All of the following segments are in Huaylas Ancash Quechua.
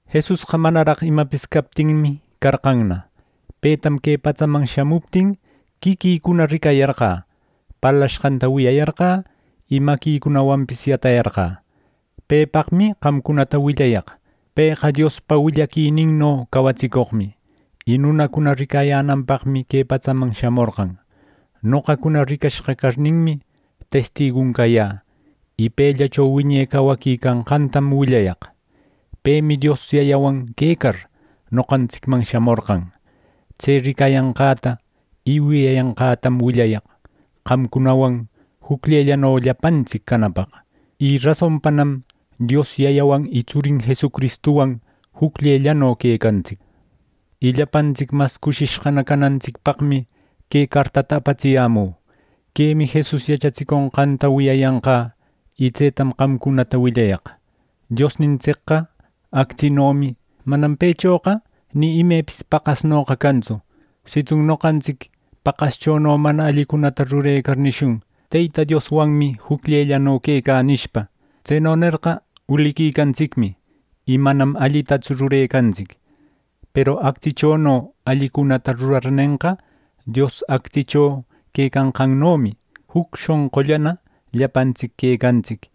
Jesusqa manaraq imapis captinmi carqanna; petam que patsaman shamuptin, quiquïcuna ricayarqä, parlashqanta wiyayarqä, y maquicunawanpis yatayarqä. Pepaqmi qamcunata willayaq: Pëqa Diospa willaquininno cawatsicoqmi. Y nunacuna ricayänanpaqmi que patsaman shamorqan. Noqacuna ricashqa carninmi, testigun cayä. Y pellacho wiñe cawaqui canqantam willayaq. Pemi Dios Yayawan quecar, noqantsicman shamorqan. Tse ricayanqäta y wiyayanqätam willayaq, qamcunawan jucllellano llapantsic canapaq. Y rasonpanam Dios Yayawan y Tsurin Jesucristuwan jucllellano quecantsic. Y llapantsic mas cushishqana canantsicpaqmi que cartata apatsiyämü. Quemi Jesus yachatsiconqanta wiyayanqä. Y tsetam qamcunata willayaq: Diosnintsicqa actsinomi. Manam pëchoqa ni imepis paqasnoqa cantsu. Sitsun noqantsic paqaschono mana allicunata rurecar nishun: “Teyta Dioswanmi jucllellano quecä” nishpa; tseno nerqa uliquicantsicmi, y manam allitatsu rurecantsic. Peru actsichono allicunata rurarnenqa, Dios actsicho quecanqannomi, juc shonqullana llapantsic quecantsic.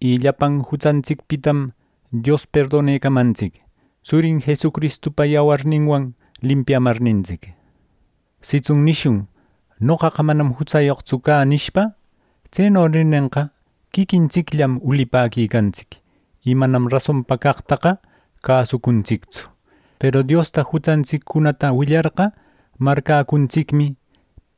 Y llapan jutsantsicpitam Dios perdonecamantsic, Tsurin Jesucristupa yawarninwan limpiamarnintsic. Sitsun nishun “Noqaqa manam jutsayoqtsu cä” nishpa; tseno nirnenqa, quiquintsicllam ulipäquicantsic, y manam rasonpa caqtaqa cäsucuntsictsu. Peru Diosta jutsantsiccunata willarqa, marcäcuntsicmi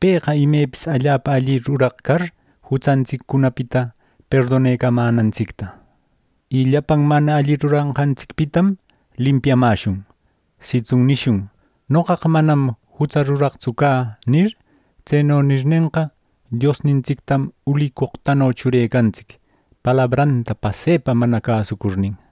pëqa imepis allapa alli ruraq car, jutsantsiccunapita perdonecamänantsicta. Y llapan mana alli ruranqantsicpitam limpiamäshun. Sitsun nishun “Noqaqa manam jutsa ruraqtsu cä” nir; tseno nirnenqa, Diosnintsictam ulicoqtano churecantsic, palabranta pasepa mana cäsucurnin.